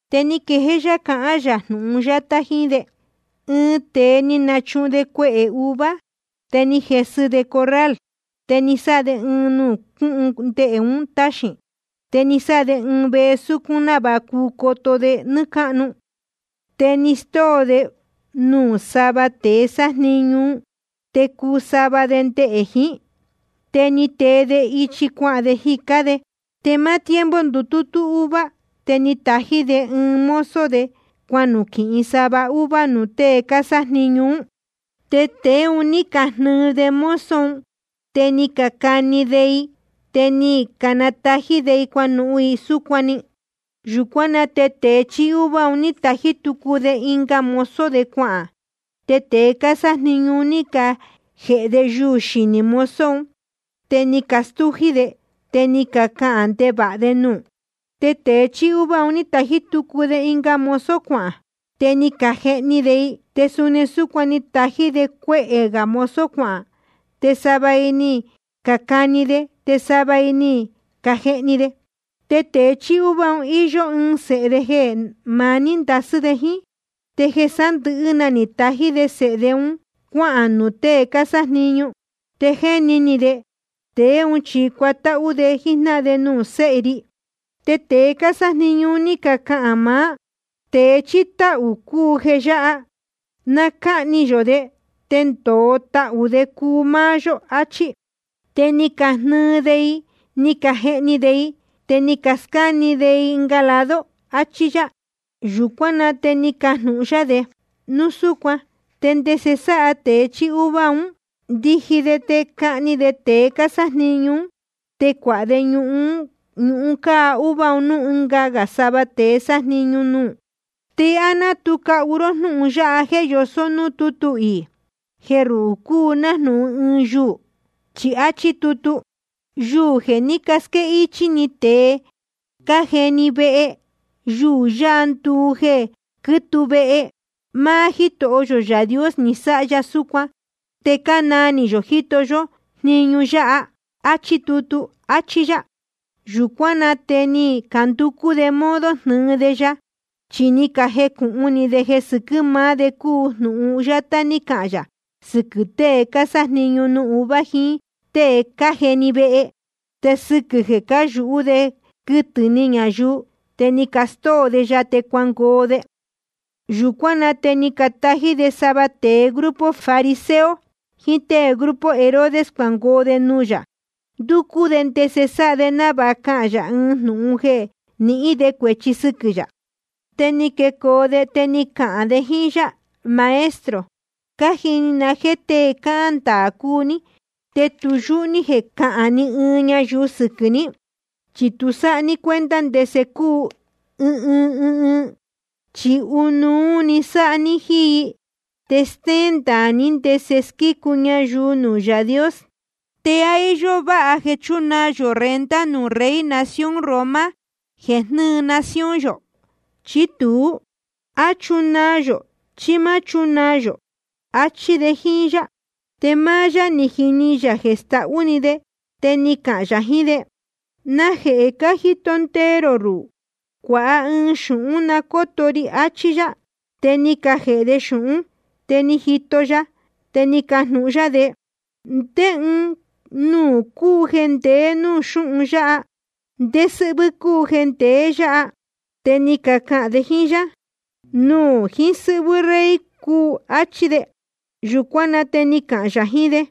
Te ni quejéé yá cahán yā jnūhun yátá jiín de jíjnáhan de: Ɨɨn tēe ni nachuhun de cuehē uva, te ni jesɨ de corral, te ni sáha de ɨɨn nuū cúhun ndehē un táxīn. Te ni sáha de ɨɨn vehe súcún návāha cuu coto de nɨ́ɨ́ cáhnu. ’Te ni stóo de nuū sava tēe sájniñu nuū, te cuu sava de ndehē jiín. Te ni tee de ichi cuahān jicá de. Te máá tiempo ndutútú uva, te ni tají de ɨɨn mozo de cuanuquīhin sava uva nuū tée cásájniñu ún. Te tēe un ní cajnɨɨ de mozo un, te ni cacani de i, te ni canatají de i cuanuhun i súcuan‑ni. Yūcuán na te tēe chíí uva un ní tají tucu de ɨnga mozo cuahān. Te tēe cásájniñu un ní cajēhe de yuū xinī mozo un, te ni castújí de, te ni cacahān ndevāha de nuū. Te tēe chíí uva ni tají tucu de ɨnga mozo cuahān. Te ni cajehni de i. Te suni súcuan ni tají de cuehē gā mozo cuahān, te sava i ni cacani de, te sava i ni cajehni de. ’Te tēe chíí uva, íyó ɨɨn sēhe de jeē maní ndasɨ́ de jíín. Te jeē sándɨ̄hɨ́ na ni tají de sēhe de un cuáhān nuū tée cásájniñu. Te jéni ni de: Tēe ún chi cuatáhú de jíjnáhan de nuū séhe ri. Te tēe cásájniñu un ní cacahān maá: Tēe chíí táhū cúu jeē yáha. Na cáhni yō de, te ndōo tahū de cuu máá yó, achí. Te ni cajnɨɨ de i, ni cajehni de i, te ni cascáne de i ɨnga lado. Achí yá. Yūcuán na te ni cajnūhun yá de: Núu súcuan ¿te ndese sáha tēe chíí uva un? Ndiji de te cahni de tēe cásájniñu ún, te cuāha de ñuhun cáá uva un núū ɨnga sava tēe sájniñu nuū. ’¿Te á ná tu cahu ró jnúhun yáha jéē yosó núū tútu iī, jeē ruhū cúu nájnūhun ɨɨn yuū? Chi áchí tutu: Yuū jeē ní casquéhichī tēe cájeni vehe, yuū yáha nduu jeē quítuu vehe. Máá Jítoho yō Yaā Dios ni sáha ya súcuan, te cánaa ni yō jíto yó jniñu yáha. Achí tutu, achí yá. Yūcuán na te ni canducú de modo jnɨɨ de ya. Chi ni cajecūhun ni de jeē sɨquɨ̄ maá de cúu jnūhun yátá ní cahān yā sɨquɨ̄ tée cásájniñu nuū uva jiín tée cájeni vehe. Te sɨquɨ̄ jeē cáyūhú de jeē quɨtɨ̄ ni ñayuu, te ni castóo de ya te cuangoo de. Yūcuán na te ni catají de sava tēe grupo fariseo jiín tée grupo Herodes cuangoo de nuū yā, ndúcú de ndese sáha de návāha cahān yā ɨɨn jnūhun jeē nihín de cuēchi sɨquɨ̄ yā. Te ni quecoo de, te ni cacahān de jíín yá: Maestro, cájini na jéē tée cáhán ndaā cúu ní, te tu yúhú ní jeē cahán ni ɨɨn ñayuu sɨquɨ̄ ní. Chi tu sáha ní cuenta ndese cúu ɨɨn ɨɨn i, chi ɨnuú‑ni sáha ní jíín i. Te stéén ndaā ní ndese squícu ñayuu nuū Yaā Dios. ¿Te á íyó váha jeē chúnaa yō renta nuū rey nación Roma jeē jnɨ́ɨ nación yō, chí tuú? ¿A chúnaa yō, chí má chúnaa yō? Achí de jíín yá. Te máá yá jiní yā jeē stahú‑ni de, te ni cahān yā jiín de: ¿Najehē cájito ndee rō ruhū? Cuāha ɨɨn xūhún na cóto ri, achí yá. Te ni cajēhe de xūhún. Te ni jito ya, te ni cajnūhun yá de: ¿Ndé ɨɨn nuū cúu jeē ndeé nuū xúhun yáha, te ndé sɨ́hvɨ́ cúu jeē ndeé yāhá? Te ni cacahān de jíín yá: Nuū jiín sɨ́hvɨ́ rey un cúu, áchí de. Yūcuán na te ni cahān yā jiín de: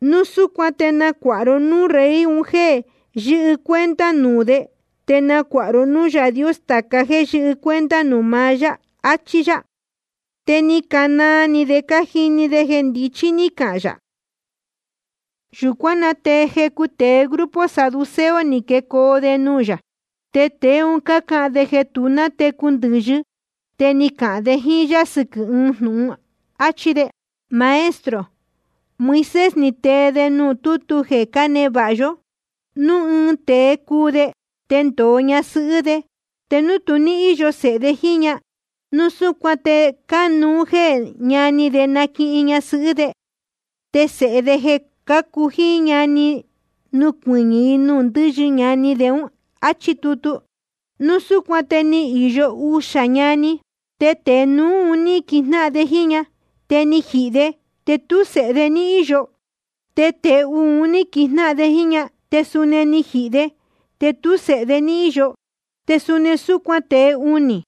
Núu súcuan te nacuāha ró núū rey un jéē yɨ́hɨ cuenta nuū de, te nacuāha ró núū Yaā Dios tāca jéē yɨ́hɨ cuenta nuū maá yá, achí yá. Te ni canaa ni de ni cajini de jeē ndichí ní cahān yā. Yūcuán na te jecu tēe grupo saduceo ni quecoo de nuū yā. Te tēe un cácahān jeē tu nátecu cuɨtɨ ndɨ̄yɨ. Te ni cacahān de jíín yá sɨquɨ̄ ɨɨn jnūhun, áchí de: Maestro, Moisés ni tee de nuū tútu jeē cánevāha yó: Núu ɨɨn tēe cuu de, te ndōo ñasɨhɨ́ de, te núu tu ní íyo sēhe de jíín ña, núu súcuan te cánuú jeē ñani de naquihin ñasɨhɨ́ de, te sēhe de jeē cácu jíín ña nucuɨñɨ̄ i nuū ndɨ́yɨ ñani de, áchí tutu. Núu súcuan te ni īyo uxā ñani. Te tēe núú ní quijnáhan de jíín ñahan. Te ni jihī de, te tú sēhe de ní íyo. Te tēe uū ni naquihin de ña, te suni ni jihī de, te tú sēhe de ní íyo. Te suni súcuan tēe unī.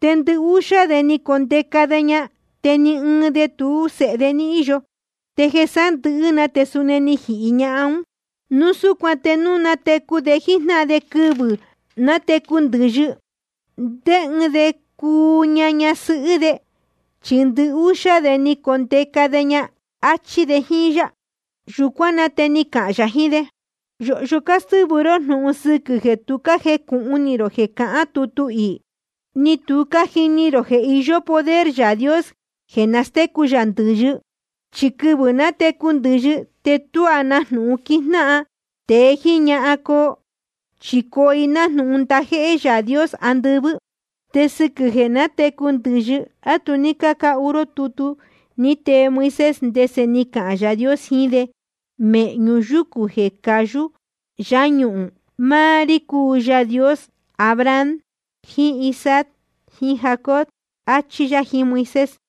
Te ndɨhúxá de ni condeca de ña, te ni ɨɨn de tú sēhe de ní íyo. Te jeē sándɨ̄hɨ́ te suni ni jihī ñahan ún. Núu súcuan te núu na nátecu de jíjnáhan de quɨvɨ̄ nátecu ndɨ̄yɨ, ¿te ndé ɨɨn de cuu ña ñasɨhɨ́ de? Chi ndɨhúxá de ni condeca de ña. Achí de jíín yá. Yūcuán na te ni cahān yā jiín de: Yōhyo cástɨ́vɨ ró jnūhun sɨquɨ̄ jeē tu cájecūhun ni rō jeē cahán tutu iī, ni tu cájini rō jeē iyó poder Yaā Dios jeē nastécu yā ndɨ̄yɨ. Chi quɨvɨ̄ nátecu ndɨ̄yɨ, te tuá na jnūhun quijnáhan tēe jíín ñahan coo. Chi coo i nájnūhun ndajéhé Yaā Dios andɨvɨ́. Te sɨquɨ̄ jeē nátecu ndɨ̄yɨ, ¿á tu ní cácahu ró tutu ní tee Moisés, ndese ni cahān Yaā Dios jiín de mēhñu yúcū jeē cayú yáñuhūn? Máá rí cúu Yaā Dios Abraham jiín Isaac jiín Jacob, achí yá jiín Moisés.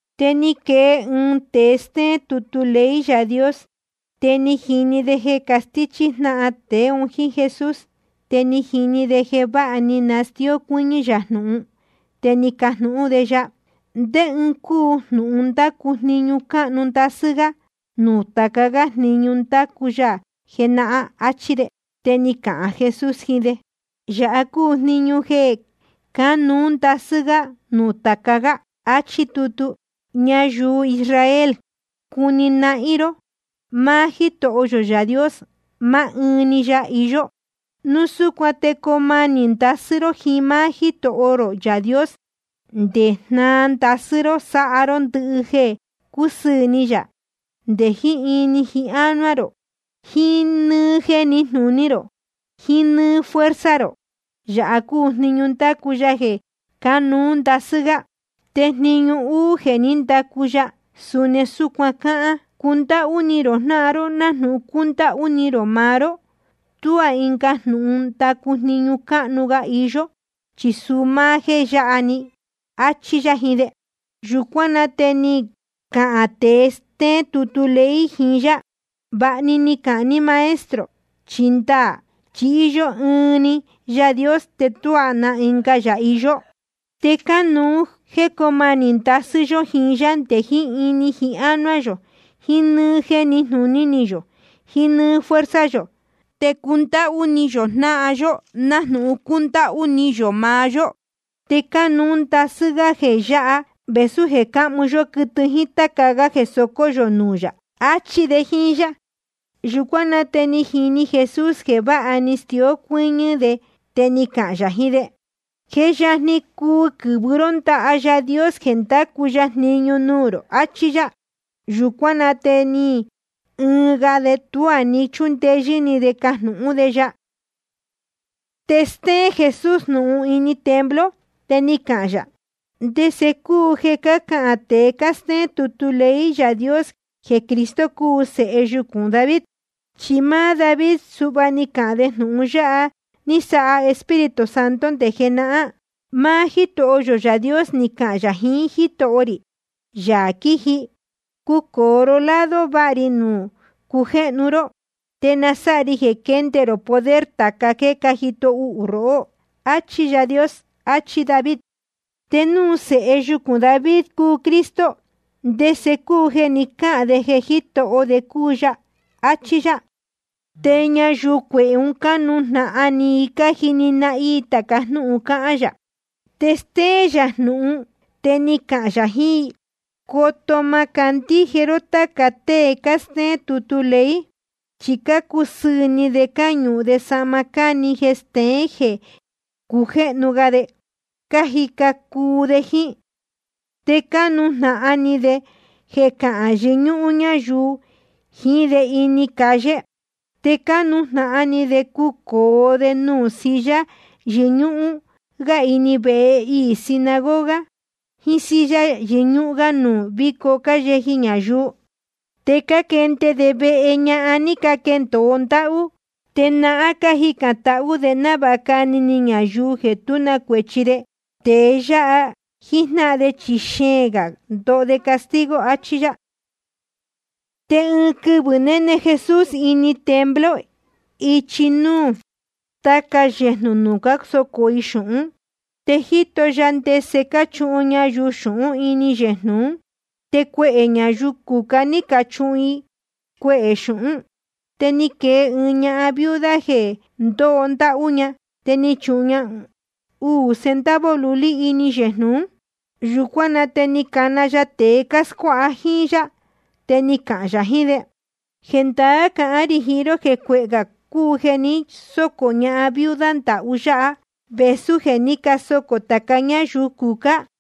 Te ni quee ɨɨn tēe stéén tutu ley Yaā Dios, te ni jini de jeē castíchí jnáhan tēe un jíín Jesús. Te ni jini de jeē váha ni nastíó cuɨ́ñɨ́ yā jnūhun. Te ni cajnūhún de ya: ¿Ndé ɨɨn cúu jnūhun ndácu jniñu cánuú ndasɨ́ gá nuū tāca gá jniñu ni ndacu ya jenahán? áchí de. Te ni cahān Jesús jiín de: Yāha cúu jniñu jeē cánuú ndasɨ́ gá nuū tāca gá. Achí tutu: Ñayuu Israel, cuni nahín ró. Máá Jítoho yō Yaā Dios, maá ɨɨn‑ni ya iyó. Núu súcuan te coo manī ndasɨ́ ró jiín máá Jítoho rō Yaā Dios, nde jnáā ndasɨ́ ró sáha ró ndɨhɨ jeē cúsɨɨ̄ ni yā, nde jiín ini jiín ánuá rō, jiín nɨ́ɨ́ jeē níjnūní rō, jiín nɨ́ɨ́ fuerza rō. Yāha cúu jniñu ndácu ya jeē cánuú ndasɨ́ gá. Te jniñu uū jeē ní ndacu ya, suni súcuan cáhán: Cundáhú ni rō jnáhan ró nájnūhun cúndáhú ni rō maá ró. Tuá ɨnga jnūhun ndácu jniñu cánuú gá iyó, chi suu máá jéē yáha‑ni. Achí yá jiín de. Yūcuán na te ni cahān tēe stéén tutu ley jiín yá: Vāha ni cahān ní, Maestro. Chi ndaā chi íyó ɨɨn‑ni Yaā Dios, te tuá na ɨnga yā iyó. Te cánuú jéē coo manī ndasɨ́ yó jiín yá nde jiín ini jiín ánuá yō, jiín nɨ́ɨ́ jeē níjnūní yō, jiín nɨ́ɨ́ fuerza yō, te cundáhú ni yō jnáhan yó nájnūhun cúndáhú ni yō maá yó. Te cánuú ndasɨ́ gá jeē yáha vēsú jeē cáhmu yó quɨtɨ jíín táca gá jeē socó yō nuū yā. Achí de jíín yá. Yūcuán na te ni jini Jesús jeē váha ni stió cuɨ́ñɨ́ de, te ni cahān yā jiín de: Je yajni cuu quɨ̄vɨ ró ndaha Yaā Dios jeē ndacu ya jniñu nuū rō, achí yá. Yūcuán na te ni ɨɨn ga de, tuá ni chúndeyɨ́ ni de cajnūhún de ya. Te stéén Jesús jnūhun ini templo, te ni cahān yā: ¿Ndese cúu jeē cácahān tēe cástéén tutu ley Yaā Dios jeē Cristo cúu sēhe yucūn David? Chi máá David suhva ni cahān de jnūhun ya ni sáha Espíritu Santo nde jenahán: Máá Jítoho yō Yaā Dios ni cahān yā jiín Jítoho rī, Yaā quiji: Cucōo ró lado váha ri nuū cujéhnu ró, te na sáha ri jeē quende rō poder tāca jéē cájito uhū rohó. Achí Yaā Dios. Achí David. Te núu sēhe yucūn David cúu Cristo, ¿te ndese cúu jeē ni cáhān de jeē Jítoho de cúu ya? áchí yá. Te ñayuu cuehē, cánujnahan ni i cájini nahín i tāca jnúhun cáhán yā. Te stéén yā jnūhun, te ni cahān yā jiín i: Coto má candíje ró táca tée cástéén tutu ley. Chi cácusɨɨ̄ ni de cáñuhun de sahma cáni jeē steén jeē cujéhnu de, cájica cuu de jíín. Te cánujnahan ni de jeē cahán yɨñúhún ñáyuu jiín de ini calle. Te cánujnahan ni de cucōo de nuū silla yɨñúhún gá ini vehe iī sinagoga, jiín silla yɨñúhún gá nuū víco cáyeji ñayuu. Te cáquende de vehe ñahan ní caquendōo ndáhú. Te nahán cájicān tahú de návāha cani ni ñayuu jeē tú na cuēchi de. Tēe yáha jíjnáhan de chi xeēn gā ndoho de castigo. Achí yá. Te ɨɨn quɨvɨ̄ néne Jesús ini templo ichi núú tāca yéjnū nuū cásocō i xūhún. Te jíto ya ndese cáchuhun ñayuu xūhún ini yejnū ún. Te cuehē ñayuu cucá ní cachuhun i cuehē xūhún. Te ni quee ɨɨn ñahan viuda jeē ndóho ndáhú. Te ni chuhun ña uū centavo lulí ini yejnū ún. Yūcuán na te ni cana ya tēe cáscuáha jíín yá, te ni cahān yā jiín de: Jendaá cahán rī jiín ró jeē cuehē gā cúu jeē ni sócō ñahan viuda ndahú yáha, vēsú jeē ní casocō tāca ñáyuu cucá.